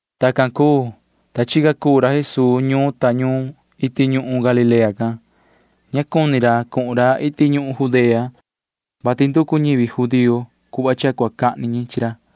Tacan cuu, ta chica cuu ra Jesuu ñuun ta ñuun iti ñuhun Galilea can. Ña cuni ra cuhun ra iti ñuhun Judea, vati nducu ñivi judío cuhva cha cua cahni ñi chi ra.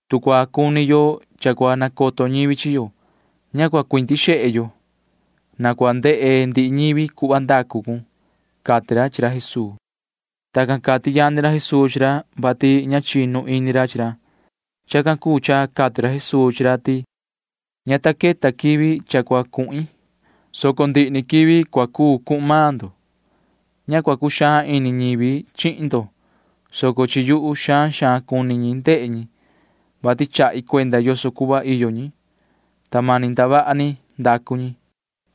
Tu cua cuni yo cha cua nacoto ñivi chi yo, ña cua cuindi xehe yo. Na cua ndehe ndihi ñivi cuhva ndacu cun ―cati ra chi ra Jesuu. Tacan cati yani ra Jesuu chi ra, vati ña chinu ini ra chi ra. Chacan cuu cha cati ra Jesuu chi ra ti: ―Ña ta queta quivi cha cua cuhin, soco ndihi ni quivi cua cuu cuhun maan ndo. Ña cua cuxaan ini ñivi chihin ndo, soco chi yuhu xaan xaan cuni ñi ndehe ñi, vati chahi cuenda yoso cuhva iyo ñi, ta mani ndavaha ni ndacu ñi.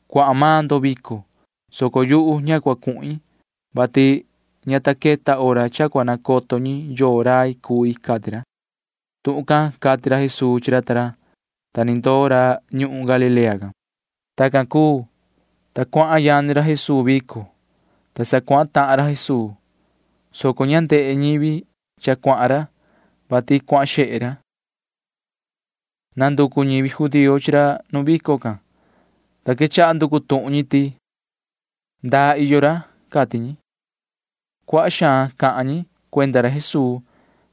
Cuahan maan ndo vico, soco yuhu ña cua cuhin, vati ña ta queta hora cha cua nacoto ñi yoo rai cui ―cati ra. Tuhun can cati ra Jesuu chi ra ta ra, ta ni ndoo ra ñuhun Galilea can. Tacan cuu, ta cuahan yani ra Jesuu vico, ta sa cuahan tahan ra Jesuu, soco ña ndehe ñivi cha cuahan ra, vati cuahan xehe ra. Nanducu ñivi judío chi ra vico, ta quechaha nducu tuhun ñi ti: ―¿Ndaa iyo ra? ―cati ñi. Cuaha xaan cahan ñi cuenda ra Jesuu,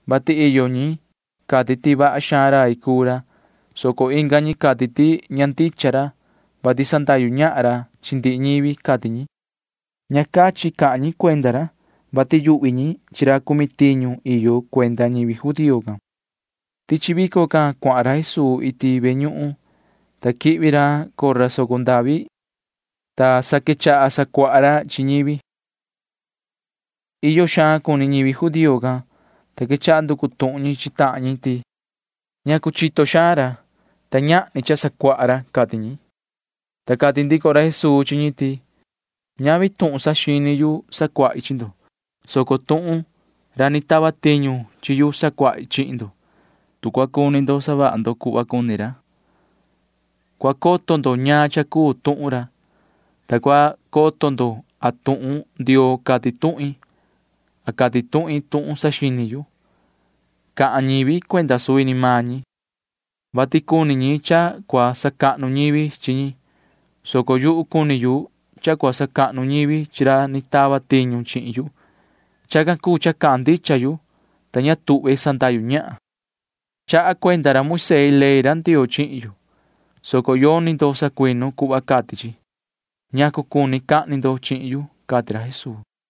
vati iyo ñi cati ti vaha xaan rai cuu ra, soco inga ñi cati ti ña ndicha ra, vati sandahyu ñahan ra chi ndihi ñivi, cati ñi. Ña cachin cahan ñi cuenda ra, vati yuhvi ñi chi ra cumi tiñu iyo cuenda ñivi judío can. Tichi vico can cuahan ra Jesuu iti ve ñuhun, ta quihvi ra cora soco ndavi, ta sa quechaha sacuaha ra chi ñivi. Iyo xaan cuni ñivi judío can, ta quechaha nducu tuhun ñi chi tahan ñi ti: ―¿Ñacu chito xaan ra, ta ñahni cha sacuaha ra? ―cati ñi. Ta cati ndico ra Jesuu chi ñi ti: ―Ñavi tuhun saxini yu sacuahi chi ndo, soco tuhun ra ni tava tiñu chi yu sacuahi chihin ndo. Tu cua cuni ndo savaha ndo cuhva cuni ra, cua coto ndo ñaan cha cuu tuhun ra, ta cua coto ndo a tuhun Ndioo cati tuhin a cati tuhin tuhun saxini yu. Cahan ñivi cuenda suvi ni maan ñi, vati cuni ñi cha cua sacahnu ñivi chi ñi, soco yuhu cuni yu cha cua sacahnu ñivi chi ra ni tava tiñu chihin yu. Chacan cuu cha cahan ndicha yu, ta ña tuhve sandahyu ñahan. ’Chaha cuenda ra Moisee ley Ndioo chihin yo, soco yoni ndo sacuinu cuhva cati chi. ¿Ñacu cuni cahni ndo chihin yu? ―cati ra Jesuu.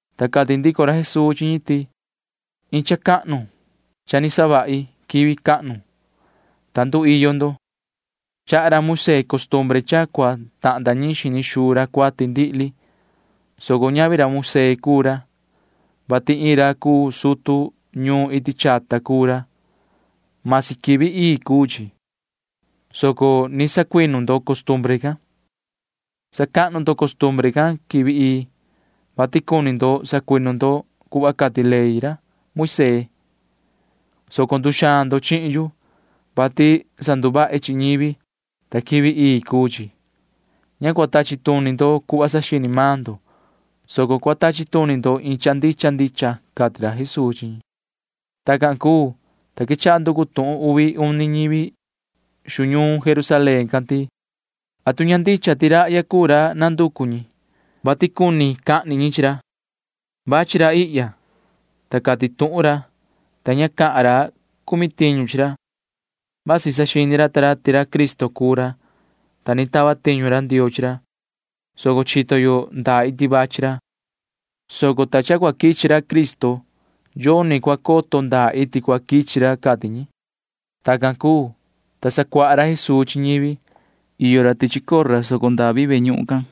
Ta cati ndico ra Jesuu chi ñi ti: ―Iin cha cahnu cha ni savahi quivi cahnu, ta nduiyo ndo. Chaha ra Moisee costumbre cha cua tahnda ñiin xini xuu ra cuati ndihli, soco ñavi ra Moisee cuu ra, vati iin ra cuu sutu ñuun iti chata cuu ra. Masi quivi ii cuu chi, soco ni sacuinu ndo costumbre can. Sacahnu ndo costumbre can quivi ii, vati cuni sacuinu ndo cuhva cati ley Moisee, soco nduxaan ndo chihin yu, vati sanduvahi chi ñivi, ta quivi ii cuu chi. Ña cua tachi tuni ndo cuhva saxini maan ndo, soco cua tachi tuni ndo iin cha ndicha ndicha ―cati ra Jesuu chi ñi. Tacan cuu, ta quechaha nducu tuhun uvi uni ñivi xu ñuun Jerusalén can ti: ―¿Atu ña ndicha ti rahya cuu ra nanducu ñi, vati cuni cahni ñi chi ra? Vachi ra ihya, ta cati tuhun ra, ta ña cahan ra cumi tiñu chi ra. Vasi saxini ra ta ra ti ra Cristo cuu ra, ta ni tava tiñu ra Ndioo chi ra, soco chito yo ndaa iti vachi ra, soco cua quichi ra cuu Cristo, ta yoni cua coto ndaa iti cua quichi ra ―cati ñi. Tacan cuu, ta sacuaha ra Jesuu chi ñivi. Iyo ra tichi cora soco ndavi can,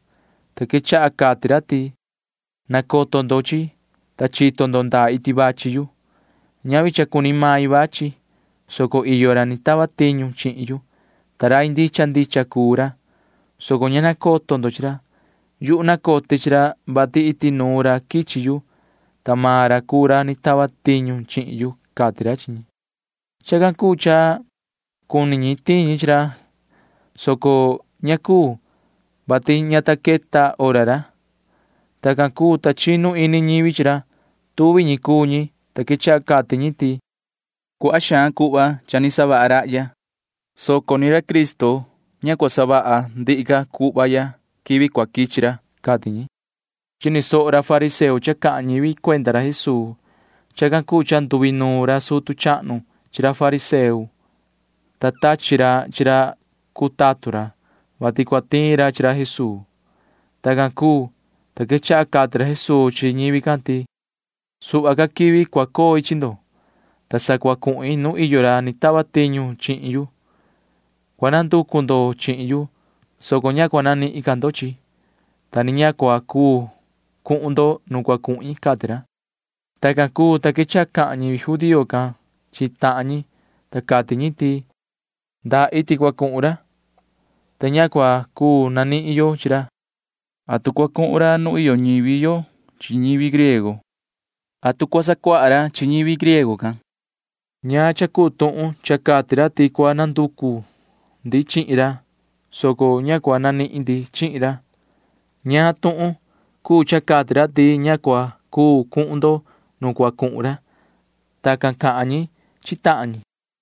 ta quechaha cati ra ti: ―Nacoto ndo chi yuhu, ta chito ndo ndaa iti vachi yu. Ñavi cha cuni main vachi, soco iyo ra ni tava tiñu chihin yu, ta rai ndicha ndicha cuu ra, soco ña nacoto ndo chi ra. Yuhu nacote chi ra, vati iti nuun ra quichi yu, ta maan ra cuu ra ni tava tiñu chihin yu ―cati ra chi ñi. Chacan cuu cha cuni ñi tiin ñi chi ra, soco ña cuu, vati ña ta queta hora ra. Tacan cuu, ta chinu ini ñivi chi ra. Tuvi ñi cuu ñi, ta quechaha cati ñi ti: ―Cuaha xaan cuhva cha ni savaha rahya, soco ra cuu Cristo ña cua savaha ca ra cuhva quivi cua quichi ra ―cati ñi. Chini soho ra fariseo cha cahan ñivi cuenda ra Jesuu. Chacan cuu cha nduinuun ra sutu chahnu chi ra fariseo, ta tachi ra chi ra cuu tatun ra, vati cua tiin ra chi ra Jesuu. Tacan cuu, ta quechaha cati ra Jesuu chi ñivi can ti: ―Suhva ni ca quivi cua coi chi ndo, ta sa cua cuhin nu iyo ra ni tava tiñu chihin yu. Cua nanducu ndo chihin yu, soco ña cua nanihin ndo, ta ni ña cua cuu cuhun ndo nu cua cuhin ―cati ra. Tacan cuu, ta quechaha cahan ñivi judío can chi tahan ñi, ta cati ñi ti: ―¿Ndaa iti cua cuhun ra, ta ña cua cuu nanihin yo chi ra? ¿Atu cua cuhun ra nu iyo ñivi yo chi ñivi griego? ¿Atu cua sacuaha ra chi ñivi griego can? ¿Ñaan cha cuu tuhun cha cati ra ti cua nanducu yo chihin ra, soco ña cua nanihin yo chihin ra? ¿Ñaan tuhun cuu cha cati ra ti ña cua cuu cuhun yo nu cua cuhun ra? Tacan cahan ñi chi tahan ñi.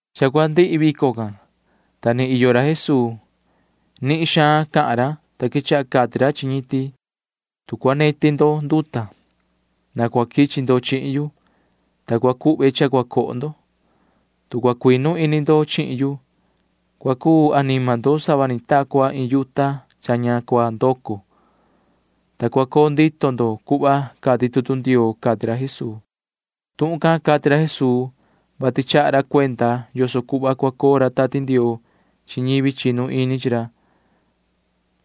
Cha cua ndihi vico can, ta ni iyo ra Jesuu. Nihin xaan cahan ra, ta quechaha cati ra chi ñi ti: ―Tu cua neti ndo nduta, na cua quichi ndo chihin yu, ta cua cuhve cha cua coho ndo. Tu cua cuinu ini ndo chihin yu, cua cuu anima ndo sava ni ta cua iin yuta cha ña cua ndoco, ta cua coo ndito ndo cuhva cati tutu Ndioo ―cati ra Jesuu. Tuhun can cati ra Jesuu, vati chaha ra cuenda yoso cuhva cua coo ra Tati Ndioo chi ñivi chinu ini chi ra.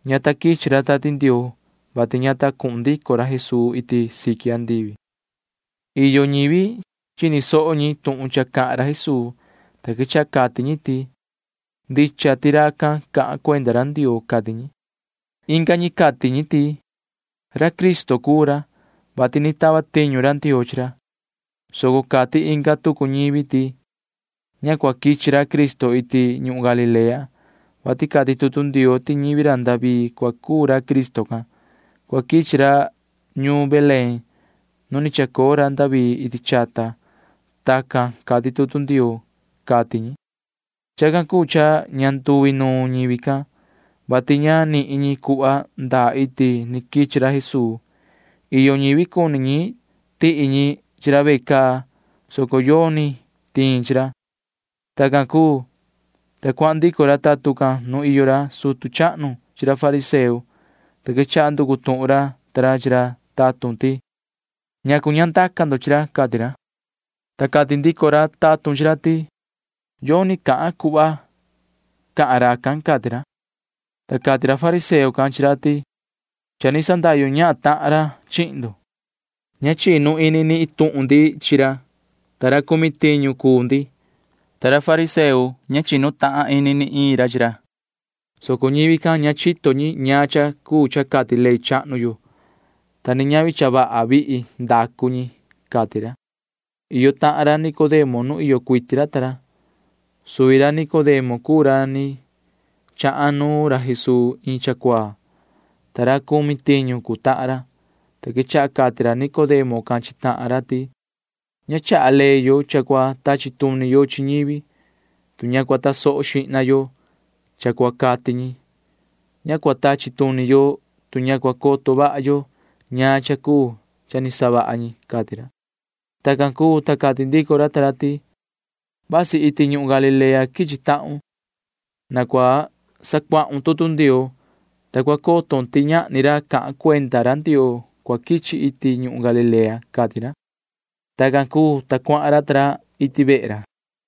Ña ta quichi ra Tati Ndioo, vati ña ta cuhun ndico ra Jesuu iti siqui andivi. Iyo ñivi chini soho ñi tuhun cha cahan ra Jesuu, ta quechaha cati ñi ti: ―Ndicha ti racan cahan cuenda ra Ndioo ―cati ñi. Inga ñi cati ñi ti: ―Ra Cristo cuu ra, vati ni tava tiñu ra Ndioo chi ra. Soco cati inga tucu ñivi ti: ―Ña cua quichi ra Cristo iti ñuhun Galilea, vati cati tutu Ndioo ti ñivi ra David cua cuu ra Cristo can. Cua quichi ra ñuun Belén nu ni chacoo ra David iti chata. Tacan cati tutu Ndioo ―cati ñi. Chacan cuu cha ña nduinuun ñivi can, [vati ña nihin ñi cuhva ndaa iti ni quichi ra Jesuu]. Iyo ñivi cuni ñi tihi ñi chi ra ve caa, soco yoni tiin chi ra. Tacan cuu, ta cuahan ndico ra tatun can nu iyo ra sutu chahnu chi ra fariseo, ta quechaha nducu tuhun ra ta ra chi ra tatun ti: ―¿Ñacu ña ndaca ndo chi ra? ―cati ra. Ta cati ndico ra tatun chi ra ti: ―Yoni cahan cuhva ni cahan racan ―cati ra. Ta cati ra fariseo can chi ra ti: ―Cha ni sandahyu ñahan tahan ra chihin ndo. Ña chinu ini ni iin tuhun ndi chi ra, ta ra cumi tiñu cuu ndi, ta ra fariseo ña ni chinu tahan ini ni iin ra, soco ñivi can ña chito ñi ñaan cha cuu cha cati ley chahnu yo, ta ni ñavi cha vaha vihi ndacu ñi ―cati ra. Iyo tahan ra Nicodemo nu iyo cuiti ra ta ra. Suvi ra Nicodemo cuu ra ni chahan nu ra Jesuu iin cha cuaa, ta ra cumi tiñu cuu tahan ra, ta quechaha cati ra Nicodemo can chi tahan ra ti: ―Ña chaha ley yo cha cua tachi tuni yo chi ñivi, tu ña cua tasoho xihna yo cha cua cati ñi. Ña cua tachi tuni yo, tu ña cua coto vaha yo ñaan cha cuu cha ni savaha ñi ―cati ra. Tacan cuu, ta cati ndico ra ta ra ti: ―¡Joi! Vasi iti ñuhun Galilea quichi tahun. Na cua sacuahun tutu Ndioo, ta cua coton ti ñahni ra cahan cuenda ra Ndioo cua quichi iti ñuhun Galilea ―cati ra. Tacan cuu, ta cuahan ra ta ra iti vehe ra.